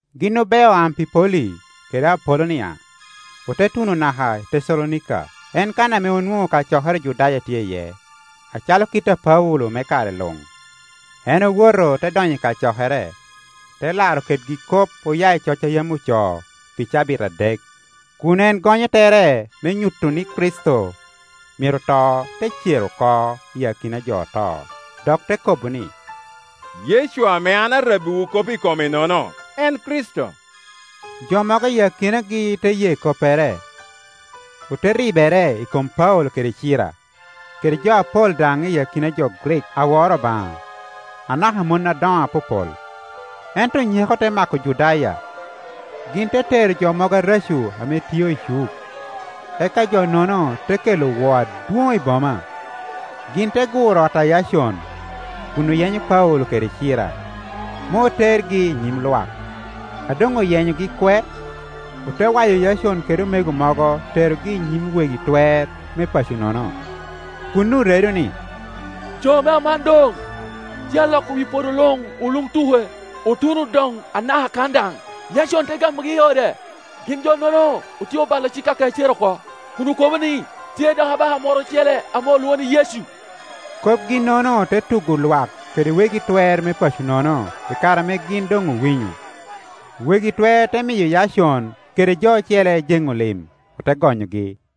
Gin obeo Ampipoli kede Apolonia, ote tuno naka i Tecalonika, en kan ame onwoŋo kacokere Ojudaya tye iye. Acalo kit a Paulo me kare luŋ, en owoto te donyo i kacokere, te laro kedgi kop oya i coc a yam ocoo pi cabit adek, kun en gonyo tere me nyuto ni Kricito myero to te cer oko i akina a jo oto, dok te kobo ni, “Yecu ame an arabbiwu kop i kome-nono, en Kricito.” Jo mogo i akinagi te ye koppere, ote ribere i kom Paulo kede Cira, kede jo apol daŋ i akina jo Grik a woro Obaŋa, anaka mon adoŋo apopol. Ento nyeko te mako Ojudaya, gin te tero jo mogo areco ame tio i cuk, eka jo-nono te kelo woo adwoŋ i boma. Gin te guro ot a Yacon kun oyenyo Paulo kede Cira me otergi i nyim lwak. A doŋoyenyogi kwe, ote wayo Yacon kede omego mogo terogi i nyim wegi twer me paco-nono, kun oredo ni, “Jo ame aman doŋtye aloko wi podo luŋ oluktuke, otuno doŋanaka kan daŋ, Yacon te gamogi i ode. Ginjo-nono otyeobalo cik a Kaicari oko, kun okobo ni tye dok abaka moro ocele ame olwoŋo ni Yecu.” Kopgi-nono te tugo lwak kede wegi twer me paco-nono i kare ame gin doŋowinyo. Wegi twer te miyo Yacon kede jo ocele jeŋo lim, ote gonyogi.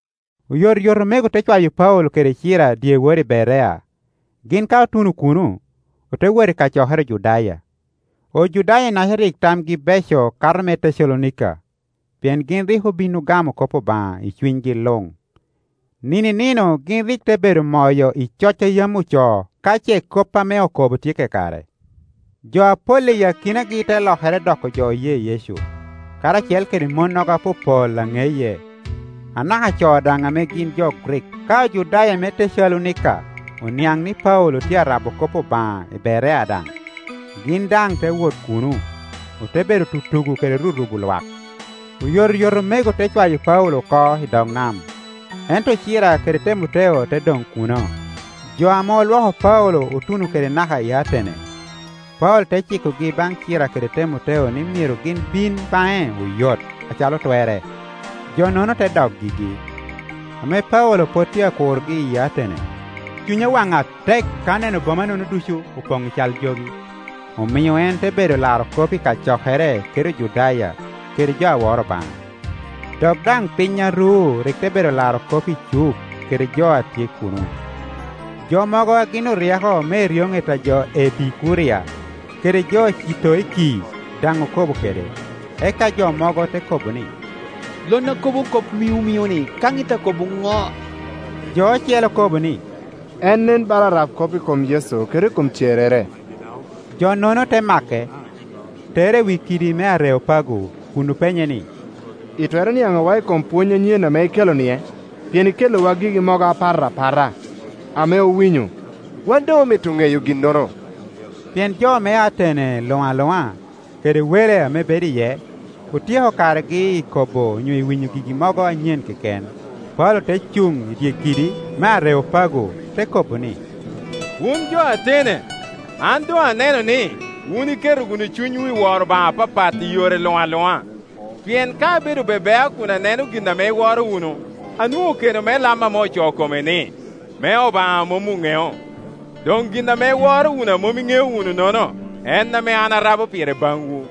Oyotoyot omego te cwayo Paulo kede Cira dyewor i Berea. Gin ka otuno kuno, ote wot i kacokere Ojudaya. Ojudaya-naca rik tamgi beco kato me Tecalonika, pien gin rik obin ogamo kop Obaŋa i cunygi luŋ; nino i nino gin rik te bedo moyo i coc a yam ocoo ka ce kop ame okobo tye kakare. Jo apol i akinagi te lokere doko jo oye Yecu, karacel kede monnogo apopol a ŋeye, anaka co daŋ ame gin jo Grik. Ka Ojudaya me Tecalonika oniaŋ ni Paulo tye a rabo kop Obaŋa i Berea daŋ, gin daŋ te wot kuno, ote bedo tutugo kede rurubo lwak. Oyotoyot omego te cwayo Paulo oko i dog nam, ento Cira kede Temoteo te doŋ kuno. Jo ame olwoko Paulo otuno kede naka i Atene; Paulo te cikogi baŋ Cira kede Temoteo ni myero gin bino baŋe oyot acalo twerre, jo-nono te dok gigi. Ame Paulo pwod tye akurogi i Atene, cunye owaŋ atek ka oneno boma-nono ducu opoŋ i cal jogi. Omio en te bedo laro kop i kacokere kede Ojudaya kede jo a woro Obaŋa, dok daŋ piny a ru rik te bedo laro kop i cuk kedejo a tye kuno. Jo mogo a gin oryeko me eryoŋet a jo Epikuria kede jo Citoiki daŋ okobo kede, eka jo mogo te kobo ni, “Lon akobo kop miŋomiŋoni ka ŋit akobo ŋo?” Jo ocele akobo ni, “En nen bala arabkop i kom Yecu kede i kom cerrere.” Jo-nono te make, tere i wi kidi me Areopago kun openye ni, “Itwero niaŋowa i kom pwony anyen ame ikelo-nie? Pien ikelliwa gigi mogo apat apata ame owinyo; wan doŋ omito ŋeyo ginnono.” Pien jo me Atene luŋ aluŋa, kede wele ame bedo iye, otyeko karegi i kobo onyo i winyo gigi mogo anyen keken. Paulo te cuŋ i dye kidi me Areopago, te kobo ni, “Wun jo Atene, an doŋaneno ni, wun iketo wunu cunywu i woro obaŋa apapat i yore luŋ aluŋa. Pien ka abedo be bea kun aneno gin ame iworo wunu, anwoŋo keno me lam ame ocoo kome ni, ‘Me Obaŋa a mom oŋeo.’ Doŋ gin ame iworo wunu a mom iŋeo wunu-nono, en ame an arabo pire baŋwu.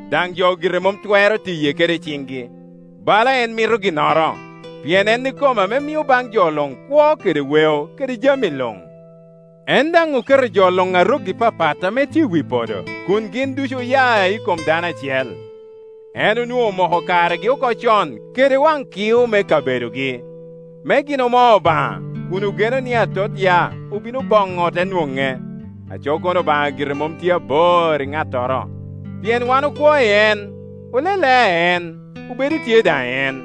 Daŋ jo gire mom twero tiye kede ciŋgi, bala en mito ginnoro; pien en ikome ame mio baŋ jo luŋ kwo kede weo kede jami Iuŋ. En daŋ oketo jo luŋ a rokgi papat ame tye i wi podo kun gin ducu oya i kom dano acel. En onwoŋo omoko karegi oko coŋ kede waŋ kio me kabedogi, me gin omo Obaŋa, kun ogenoni atot ya obino boboŋo ote nwoŋe. Aco kono Obaŋa gire mom tye bor i ŋattoro. Pien ‘Wan okwo i en, olelea i en, obedo tye daŋ i en’;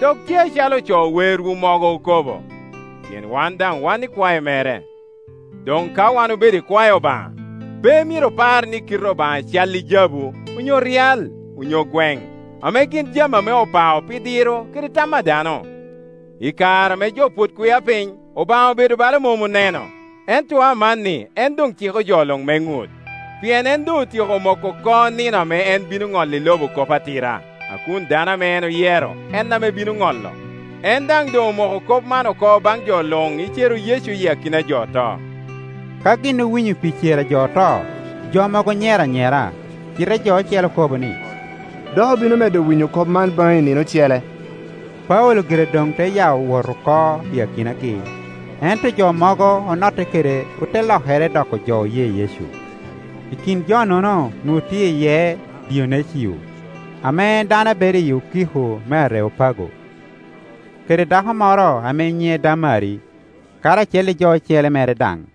Dok tye acalo oco werwu mogo okobo, ‘Pien wan daŋ wan ikwae mere.’ Doŋ ka wan obedo ikwae Obaŋa, pe myero opar ni kite Obaŋa calli jabu, onyo ryal, onyo gweŋ, ame gin jami ame opao pi diro kede tam a dano. I kare ame jo pwod kwia piny Obaŋa obedo bala mom oneno, ento amanni en doŋciko jo luŋ me ŋut. Pien en doŋotyeko moko oko nino ame en bino ŋolli lobo kop atira, a kun dano ame en oyero en a bino ŋolo. En daŋ doŋomoko kop man oko baŋ jo luŋ i cero Yecu i akina a jo oto.” Ka gin owinyo pi cer a jo oto, jo mogo onyero anyera, cite jo ocele okobo ni, “Dok obino medo winyo kop man baŋi i nino ocele.” Paulo gire doŋte ya wot oko i akinagi. Ento jo mogo onotte kede ote lokere doko jo oye Yecu; i kin jo-nono onwoŋo tye iye Dionecio ame en dano a bedo i okiko me Areopago, kede dako moro ame nyiŋe Damari, karacel i jo ocele mere daŋ.